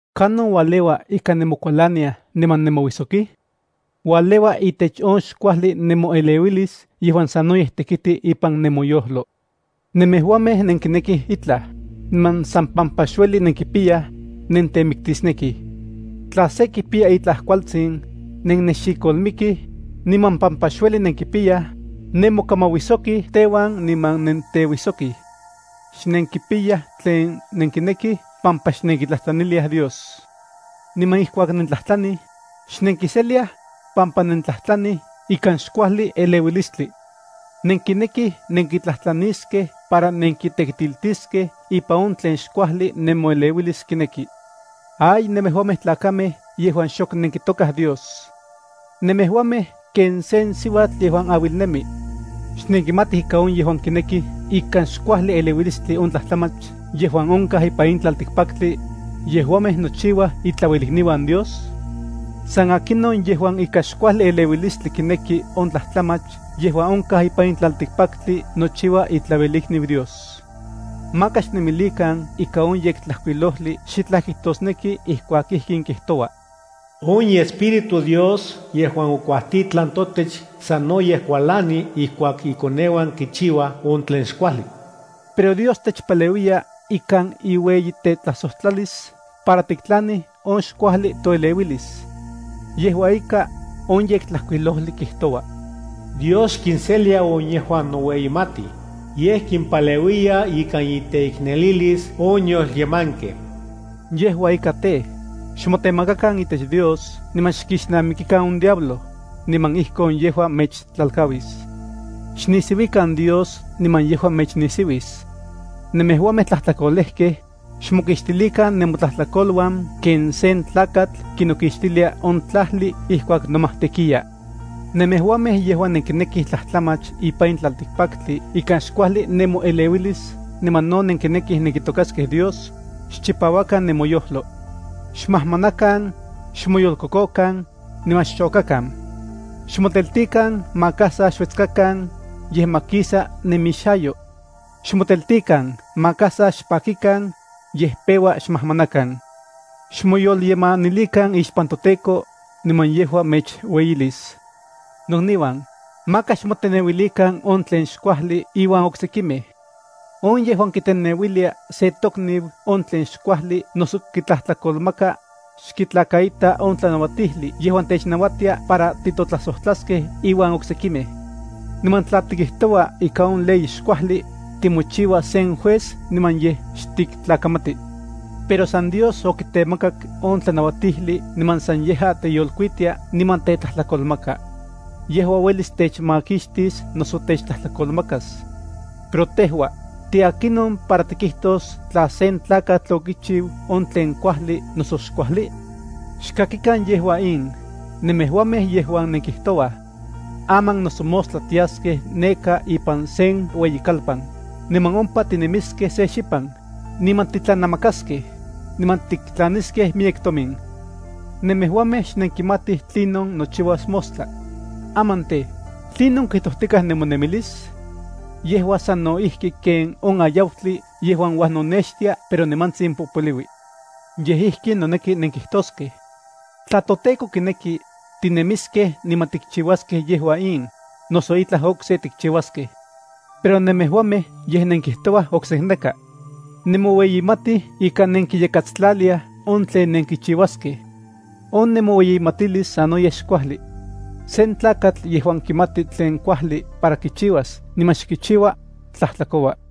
¿Kanon ualeua ika nemokualaniaj niman nemouijsoki? Ualeua itech on xkuajli nemoeleuilis yejuan sanoyej tekiti ipan nemoyojlo. Nemejuamej nenkinekij itlaj, niman san pampa xueli nenkipiyaj, nentemiktisnekij. Tla se kipiya itlaj kualtsin, nennexikolmikij, niman pampa xueli nenkipiyaj, nemokamauijsojkij teuan niman nenteuijsokij. Xnenkipiyaj tlen nenkinekij pampa xnenkitlajtlaniliaj Dios. Niman ijkuak nentlajtlanij, xnenkiseliaj, pampa nentlajtlanij ikan xkuajli eleuilistli. Nenkinekij nenkitlajtlaniskej para nenkitekitiltiskej ipan on tlen xkuajli nemoeleuilis kineki. ¡Ay nemejuamej tlakamej yejuan xok nenkitokaj Dios! Nemejuamej ken sen siuatl yejuan auilnemi. ¿Xnenkimatij ika on yejuan kinekij ikan xkuajli eleuilistli on tlajtlamach yejuan onkaj ipan in tlaltikpaktli, yejuamej nochiuaj itlauelikniuan Dios? San akinon yejuan ikan xkuajli eleuilistli kineki on tlajtlamach yejuan onkaj ipan in tlaltikpaktli nochiua itlauelikniu Dios. Maka xnemilikan ika on Yektlajkuilojli xitlaj kijtosneki ijkuak ijkin kijtoua: On iEspíritu Dios yejuan okuajtitlan totech sanoyej kualani ijkuak ikoneuan kitokaj on tlen xkuajli. Pero Dios techpaleuiya ikan iueyitetlajsojtlalis para tiktlanij on xkuajli toeleuilis. Yejua ika, on Yektlajkuilojli kijtoua: Dios xkinselia on yejuan noueyimatij, yej kimpaleuiya ikan iteiknelilis on yolyemankej. Yejua ika tej, xmotemakakan itech Dios niman xkixnamikikan on diablo, niman ijkon yejua mechtlalkauis. Xnisiuikan Dios niman yejua mechnisiuis. Nemejuamej tlajtlakolejkej, xmokixtilikan nemotlajtlakoluan ken sen tlakatl kinokixtilia on tlajli ijkuak nomajtekiya. Nemejuamej yejuan nenkinekij tlajtlamach ipan in tlaltikpaktli ikan xkuajli nemoeleuilis niman no nenkinekij nenkitokaskej Dios, xchipauakan nemoyojlo. Xmajmanakan, xmoyolkokokan, niman xchokakan. Xmoteltikan maka sa xuetskakan, yej ma kisa nemixayo. Xmoteltikan maka sa xpakikan, yej peua xmajmanakan. Xmoyolyemanilikan ixpan toTEKO, niman yejua mechueyilis. Nokniuan, maka xmoteneuilikan on tlen xkuajli iuan oksekimej. On yejuan kiteneuilia sen tokniu on tlen xkuajli noso kitlajtlakolmaka, xkitlakaita on tlanauatijli yejuan technauatia para titotlajsojtlaskej iuan oksekimej. Niman tla tikijtoua ika on ley xkuajli, timochiua sen juez niman yej xtiktlakamati. Pero san Dios okitemakak on tlanauatijli niman san yejua teyolkuitia niman tetlajtlakolmaka. Yejua uelis techmakixtis noso techtlajtlakolmakas. Pero tejua, ¿tiakinon para tikijtos tla sen tlakatl okichiu on tlen kuajli noso xkuajli? Xkakikan yejua in, nemejuamej yejuan nenkijtouaj: “Aman noso mostla tiaskej neka ipan sen ueyikalpan, niman ompa tinemiskej se xipan, niman titlanamakaskej, niman tiktlaniskej miyek tomin.” Nemejuamej xnenkimatij tlinon nochiuas mostla. Aman tej, ¿tlinon kijtojtikaj nemonemilis? Yejua sano ijki ken on ayautli yejuan uajnonextia pero nimantsin popoliui. Yej ijkin noneki nenkijtoskej: “Tla toTEKO kineki, tinemiskej niman tikchiuaskej yejua in, noso itlaj okse tikchiuaskej.” Pero nemejuamej yej nenkijtouaj oksekneka. Nemoueyimatij ika nenkiyakatstlaliaj on tlen nenkichiuaskej. On nemoueyimatilis sanoyej xkuajli. Sen tlakatl yejuan kimati tlen kuajli para kichiuas niman xkichiua, tlajtlakoua.